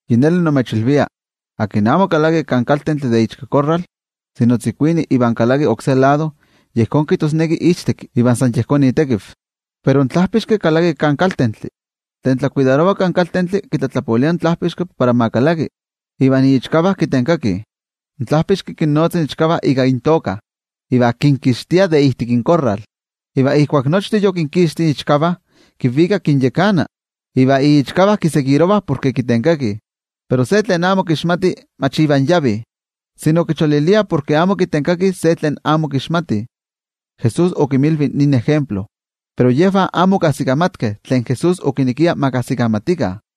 ’Yi neli nimechilvia, tlen amo kalaki kan kaltentli de ichkakorral, sino tzikuini iva kalaki oksé lado, yejón kijtosneki ichtekki iva san yejón itekiv. Pero in tlajpixki kalaki kan kaltentli. Tlen tlakuidarova kan kaltentli kitlatlapolia in tlajpixki para ma kalaki, iva iichkavah kitenkakih. In tlajpixki kinnotza iichkavah ika intoka, iva kinkixtia de ijtik inkorral. Iva ijkuak nochtin yokinkixti iichkavah, kinvika kinyakana. Iva iichkavah kitokah porke kitenkakih. Pero se tlen amo kixmatih mach ivan yavih, sino kicholiliah porke amo kitenkakih se tlen amo kixmatih. Jesús okinmilvi nin ejemplo, pero yejvah amo okajsikamatkeh tlen Jesús okinekia ma kajsikamatikah.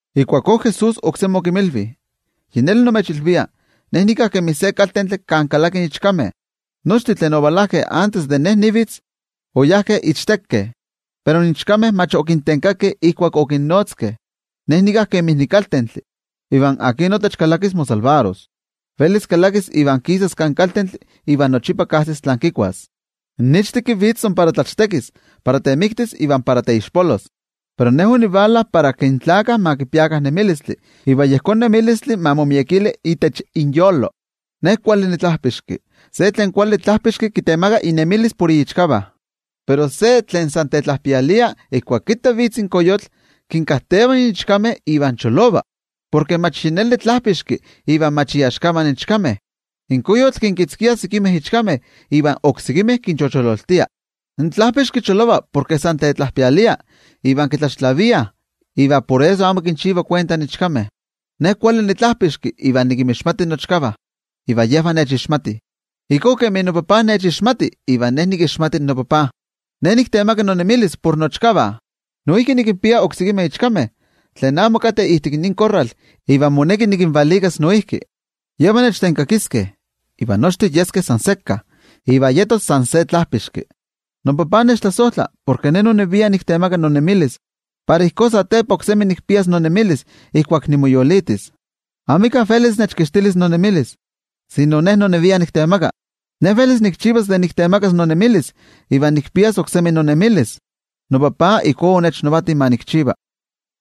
Ijkuakó Jesús oksemi okinmilvi: —Yi neli nimechilvia: Ne nika kemi se kaltentli kan kalakih ichkameh. Nochtin tlen ovalajkeh antes de Ne nivitz, oyajkeh ichtekeh. Pero in ichkameh mach okintenkakeh ijkuak okinnotzkeh. Ne nika kemi nikaltentli. Iva akin notech kalakis, momakixtis. Velis kalakis iva kisas kan kaltentli iva nochipa kajsis tlen kikuas. ’In ichtekki vitz san para tlachtekis, para temiktis iva para teixpolos. Pero Ne onivala para ke in tlaltikpaktlakah ma kipiakah nemilistli, iva yejón nemilistli ma momiekili itech inyolo. Ne kuali nitlajpixki. Se tlen kuali tlajpixki kitemaka inemilis por iichkavah. Pero se tlen san tetlajpialia, ijkuak kitta vitz in koyotl, kinkakajteva in ichkameh iva cholova, porke mach yi neli tlajpixki iva mach iaxkavah in ichkameh. In koyotl kinkitzkia sekimeh ichkameh iva oksekimeh kinchochololtia. In tlajpixki cholova porke san tetlajpialia iva kitlaxtlaviah, iva por eso amo kinchiva kuenta in ichkameh. ’Ne kuali nitlajpixki iva nikinmixmati nochkavah, iva yejvah nechixmatih, ijkó kemi noTajtzi nechixmati iva Ne nikixmati noTajtzi. Ne niktemaka nonemilis por nochkavah. Noijki nikinpia oksekimeh ichkameh, tlen amo kateh ijtik nin korral iva moneki nikinvalikas noijki. Yejvah nechtenkakiskeh, iva nochtin yeskeh san sekka, iva yetos san se tlajpixki. ’NoTajtzi nechtlasojtla, porke Ne nonevia niktemaka nonemilis, para ijkó satepa oksemi nikpias nonemilis ijkuak nimoyolitis. Amika velis nechkixtilis nonemilis, sino Ne nonevia niktemaka. Ne velis nikchivas de niktemakas nonemilis iva de nikpias oksemi nonemilis. NoTajtzi ijkó onechnavati ma nikchiva.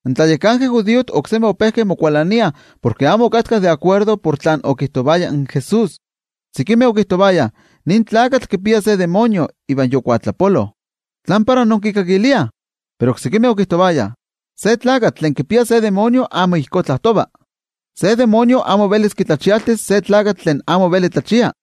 In tlayakankeh judiojtih oksemi ope mokualaniah porke amo okatkah de akuerdo por tlen okijtovaya in Jesús. Sekimeh okijtovayah: —Nin tlakatl kipia se amo kuali ejekatl iva yokuatlapolo. ¿Tlán para inkikakiliah? Pero oksekimeh okijtovayah: —Se tlakatl tlen kipia se amo kuali ejekatl amo ijkó tlajtova. Se amo kuali ejekatl amo velis kitlachialtis se tlakatl tlen amo veli tlachia.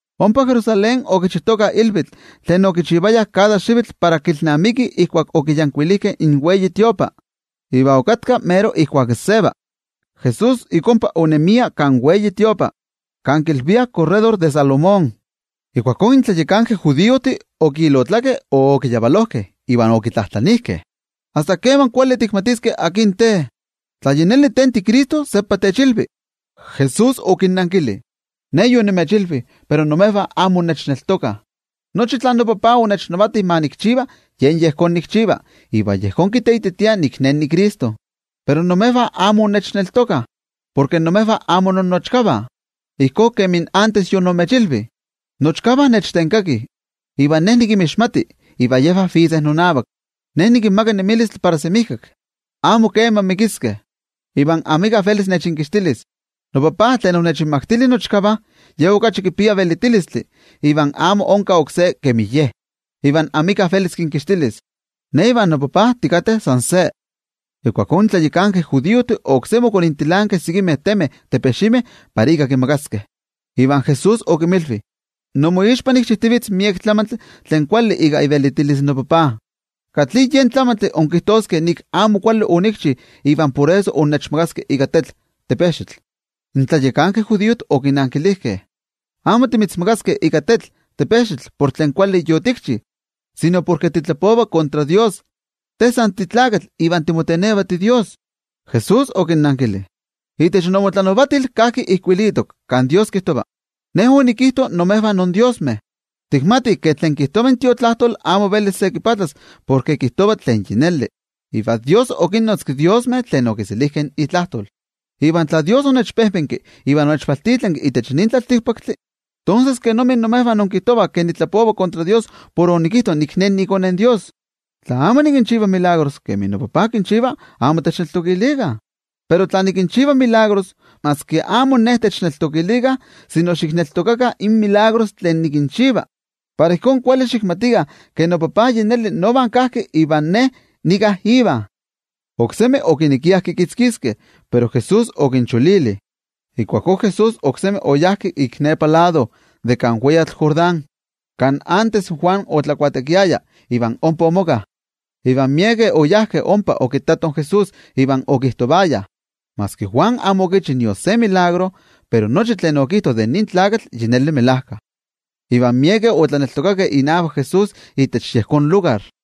Ompa Jerusalén okichijtokah ilvitl tlen okichivayah kada xivitl para kilnamikih ijkuak okiyankuilijkeh in templo. Iva okatka mero ijkuak seva. Jesús ik ompa onemia kan templo, kan kilviah korredor de Salomón. Ijkuakó in tlayakankeh judiojtih okiyavalojkeh iva okitlajtlanijkeh: —¿Asta keman kuali tikmatiskeh akin te? Tla yi neli te tiCristo seppa techilvi. Jesús okinnankili: —Ne yonimechilvi akin Ne, pero imejvah amo innechneltokah. Nochi tlen noTajtzi onechnavati ma nikchiva yen yejón nikchiva iva yejón kiteititia akin Ne. Pero imejvah amo innechneltokah, porke imejvah amo innochkavah, ijkó kemi achto yonimechilvi. Nochkavah nechtenkakih, iva Ne nikinmixmati iva yejvah vitzeh nonavak. Ne nikinmaka nemilistli para semijkak. Amo kema mikiskeh, iva amika velis nechinkixtilis. NoTajtzi yen onechinmaktili, Ye okachi velitini ke nochtin, iva amika velis kinkixtilis. Ne ivan noTajtzi timochijtokeh san se. Ijkuakó in tlayakankeh judiojtih oksemi okonintilankeh sekimeh temeh para ika kimakaskeh. Iva Jesús okinmilvi: —Inmoixpa nikchijtivitz miek tlamantli tlen kuali ika ivelitilis noTajtzi. ¿Katli yen tlamantli inkijtoskeh ke amo kuali tlen onikchi iva por eso innechmakaskeh ika tetl? In tlayakankeh judiojtih okinankilijkeh: —Amo timitzmakaskeh ika tetl por tlen kuali yotikchi, sino porke titlapova kontra Dios. Te san titlakatl iva timoteneva tiDios. Jesús okinnankili: —Itech inmotlanavatil kajki ijkuilitok kan Dios kijtova: “Ne onikijto imejvah indiosmeh.” Tikmatih ke tlen kijtova in Tiotlajkuiloli amo velis se kipatlas porke kijtova tlen yi neli, iva Dios okinnotzki diosmeh tlen okiselijkeh itlajtol. Iva tla Dios onechpejpenki iva onechvaltitlanki itech nin tlaltikpaktli, tonses, ¿kenomi imejvah inkijtovah ke nitlapova kontra Dios por onikijto nik Ne niiKone in Dios? Tla amo nikinchiva in chivalistih kemi noTajtzi kinchiva, amo techneltokilikah. Pero tla nikinchiva, tonses maski Ne amo techneltokilikah, sino xikinneltokakah in chivalistih tlen nikinchiva, para ijkó kuali xikmatikah ke noTajtzi yi neli nova kajki iva Ne nika Iva. Oksemi okinekiah kikitzkiskeh, pero Jesús okincholili. Ijkuakó Jesús oksemi oyá ik nepa lado de kan weyatl Jordán, kan achto in Juan otlabautisarovaya iva ompa omoka. Iva miekeh oyajkeh ompa okittatoh in Jesús iva okijtovayah: —Maski in Juan amo okichi nion se tetzavkaneskayotl, pero nochi tlen okijto de nin tlakatl yi neli melajka. Iva miekeh otlaneltokakeh inavak Jesús itech yejón lugar.